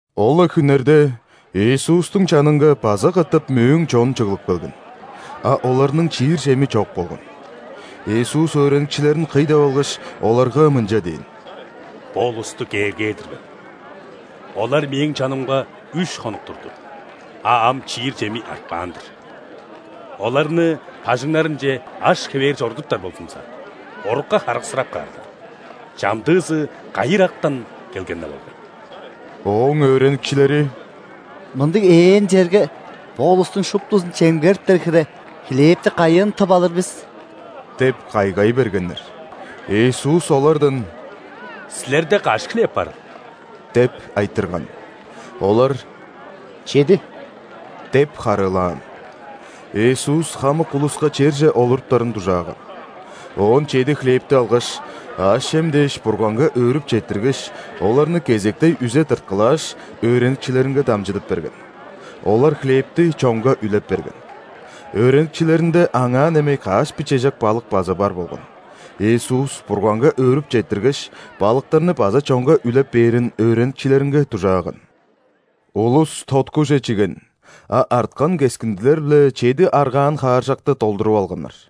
Ол-ла хүннерде Иисустуң чанынга база катап мөөң чон чыглып келген, а оларның чиир чеми чок болган. Иисус өөреникчилерин кый деп алгаш, оларга мынча дээн: «Бо улусту кээргээр-дир мен: олар Мээң чанымга үш хонук турду, а ам чиир чеми артпаан-дыр. Оларны бажыңнарынче аш хевээр чорудуптар болзумза, орукка харыксырап каарлар, чамдыызы кайы ырактан келген-не болгай». Ооң өөреникчилери: «Мындыг ээн черге бо улустуң шуптузун чемгериптер хире хлебти кайыын тып алыр бис?» – деп кайгай бергеннер. Иисус олардан: «Силерде каш хлеб барыл?» – деп айтырган. Олар: «Чеди» – деп харыылаан. Иисус хамык улуска черже олуруптарын дужааган. Оон чеди хлебти алгаш, аъш-чем дээш Бурганга өөрүп четтиргеш, оларны кезектей үзе тырткылааш, өөреникчилеринге дамчыдып берген. Олар хлебти чонга үлеп берген. Өөреникчилеринде аңаа немей каш бичежек балык база бар болган. Иисус Бурганга өөрүп четтиргеш, балыктарны база чонга үлеп бээрин өөреникчилеринге дужааган. Улус тоткуже чиген, а арткан кескиндилер-биле чеди аргаан хааржакты долдуруп алганнар.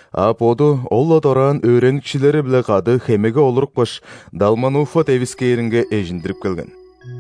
а Боду ол-ла дораан өөреникчилери-биле кады хемеге олурупкаш, Далмануфа девискээринге эжиндирип келген.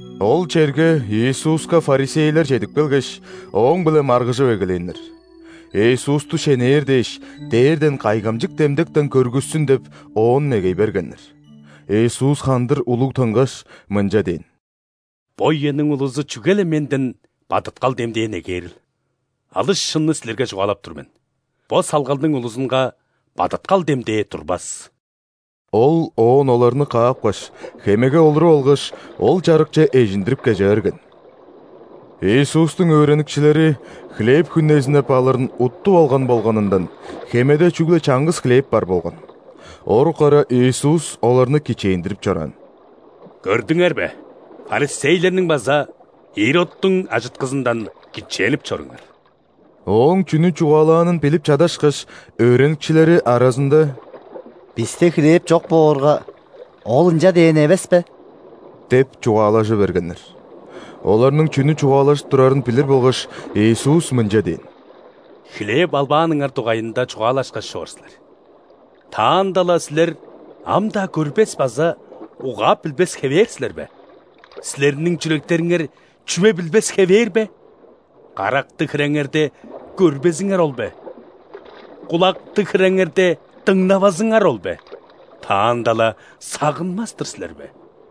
Ол черге Иисуска ·фарисейлер чедип келгеш, Ооң-биле маргыжып эгелээннер. Иисусту шенээр дээш, дээрден кайгамчык демдектен көргүссүн деп Оон негей бергеннер. Иисус хандыр улуг тынгаш, мынча дээн: «Бо үениң улузу чүге-ле Менден бадыткал демдээ негээрил? Алыс шынны силерге чугаалап тур мен: бо салгалдың улузунга бадыткал демдээ турбас». Ол оон оларны каапкаш, хемеге олуруп алгаш, ол чарыкче эжиндирип кеже берген. Иисустуң өөреникчилери хлеб хүнезиннеп алырын уттуп алган болганындан, хемеде чүгле чаңгыс хлеб бар болган. Орук ара Иисус оларны кичээндирип чораан: «Көрдүңер бе, ·фарисейлерниң база Иродтуң ажыткызындан кичээнип чоруңар». Ооң чүнү чугаалаанын билип чадашкаш, өөреникчилери аразында: «Бисте хлеб чок боорга, Ол ынча дээн эвеспе?» – деп чугаалажы бергеннер. Оларның чүнү чугаалажып турарын билир болгаш, Иисус мынча дээн: «Хлеб албааныңар дугайында чугаалашкаш чоор силер. Таанда-ла силер ам-даа көрбес база угаап билбес хевээр силер бе? Силерниң чүректериңер чүве билбес хевээр бе? Карактыг хиреңерде, көрбезиңер ол бе?Кулактыг хиреңерде, дыңнавазыңар ол бе? Таанда-ла сагынмас-тыр силер бе?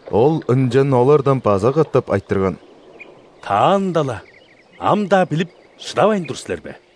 Ол ынчан олардан база катап айтырган: «Таанда-ла ам-даа билип шыдавайн тур силер бе?»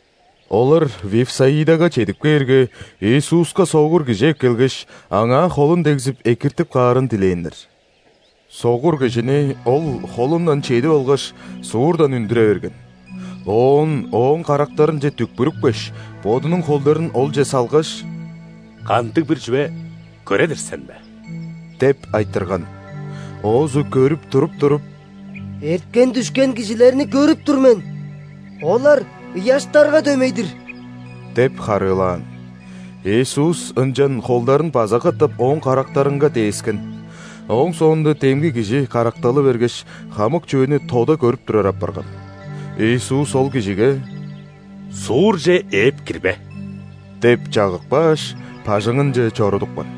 Олар Вифсаидага чедип кээрге, Иисуска согур кижи эккелгеш, аңаа холун дегзип, экиртип каарын дилээннер. Согур кижини Ол холундан чедип алгаш, суурдан үндүре берген. Оон ооң карактарынче дүкпүрүпкеш, Бодунуң холдарын олче салгаш: «Кандыг-бир чүве көре-дир сен бе?» – деп айтырган. Оозу көрүп туруп-туруп: «Эрткен-дүшкен кижилерни көрүп тур мен. Олар ыяштарга дөмей-дир» – деп харыылаан. Иисус ынчан холдарын база катап ооң карактарынга дээскен. Ооң соонда демги кижи каракталы бергеш, хамык чүвени тода көрүп турар апарган. Иисус ол кижиге: «Суурже ээп кирбе» – деп чагып кааш, бажыңынче чорудупкан.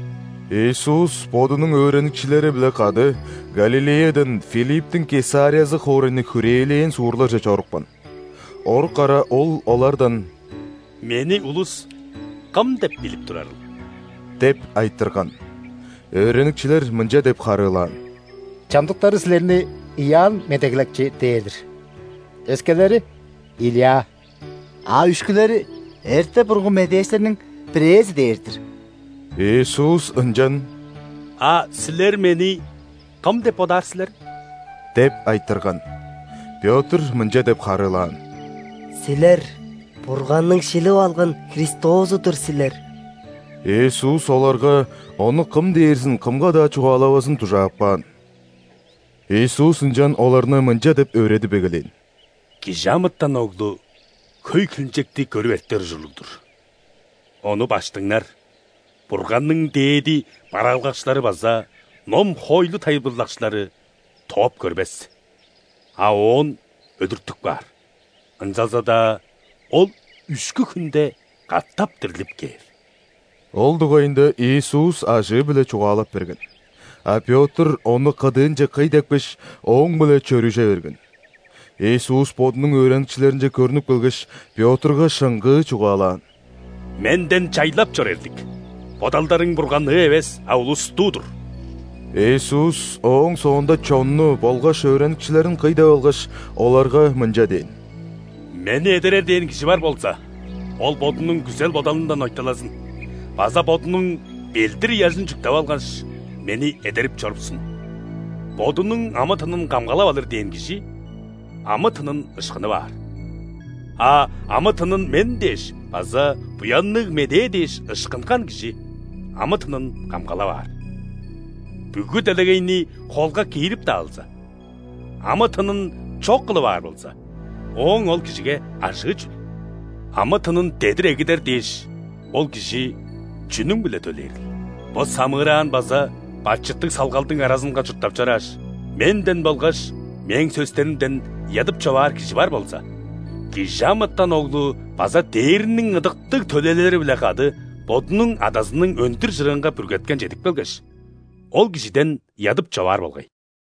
Иисус Бодунуң өөреникчилери-биле кады Галилеядан Филипптиң Кесариязы хоорайны хүрээлээн суурларже чорупкан. Орук ара Ол олардан: «Мени улус Кым деп билип турарыл?» – деп айтырган. Өөреникчилер мынча деп харыылаан: «Чамдыктары Силерни Иоанн Медеглекчи дээр-дир, өскелери – Илия, а үшкүлери – эрте-бурунгу медээчилерниң бирээзи дээр-дир». Иисус ынчан: «А силер Мени кым деп бодаар силер?» – деп айтырган. Пётр мынча деп харыылаан: «Силер – Бурганның шилип алган Христозу-дур силер». Иисус оларга Ону кым дээрзин кымга-даа чугаалавазын дужаап каан. Иисус ынчан оларны мынча деп өөредип эгелээн: «·Кижи амытан Оглу хөй хилинчекти көрүп эртер ужурлуг-дур, Ону ·баштыңнар, Бурганның дээди бараалгакчылары база ном-хоойлу тайылбырлакчылары тооп көрбес, а оон өлүртүп каар, ынчалза-даа Ол үшкү хүнде катап дирлип кээр». Ол дугайында Иисус ажыы-биле чугаалап берген. А Пётр Ону кыдыынче кый депкеш, Ооң-биле чөрүже берген. Иисус Бодунуң өөреникчилеринче көрнүп келгеш, Пётрга шыңгыы чугаалаан: «Менден чайлап чор, эрлик! Бодалдарың Бурганныы эвес, а улустуу-дур». Иисус ооң соонда чонну болгаш өөреникчилерин кый деп алгаш, оларга мынча дээн: «Мени эдерер дээн кижи бар болза, ол бодунуң күзел-бодалындан ойталазын база бодунуң ·белдир-ыяжын чүктеп алгаш, Мени эдерип чорупсун. Бодунуң амы-тынын камгалап алыр дээн кижи амы-тынын ышкынып аар, а амы-тынын Мен дээш база Буянныг Медээ дээш ышкынган кижи амы-тынын камгалап аар. Бүгү делегейни холга киирип-даа алза, амы-тынын чок кылып аар болза, ооң ол кижиге ажыы чүл? Амы-тынын дедир эгидер дээш, ол кижи чүнүң-биле төлээрил? Бо самыыраан база бачыттыг салгалдың аразынга чурттап чорааш, Менден болгаш Мээң сөстеримден ыядып-човаар кижи бар болза, ·Кижи амытан Оглу база дээрниң ыдыктыг төлээлери-биле кады Бодунуң Адазының өндүр чырыынга бүргеткен чедип келгеш, ол кижиден ыядып-човаар болгай».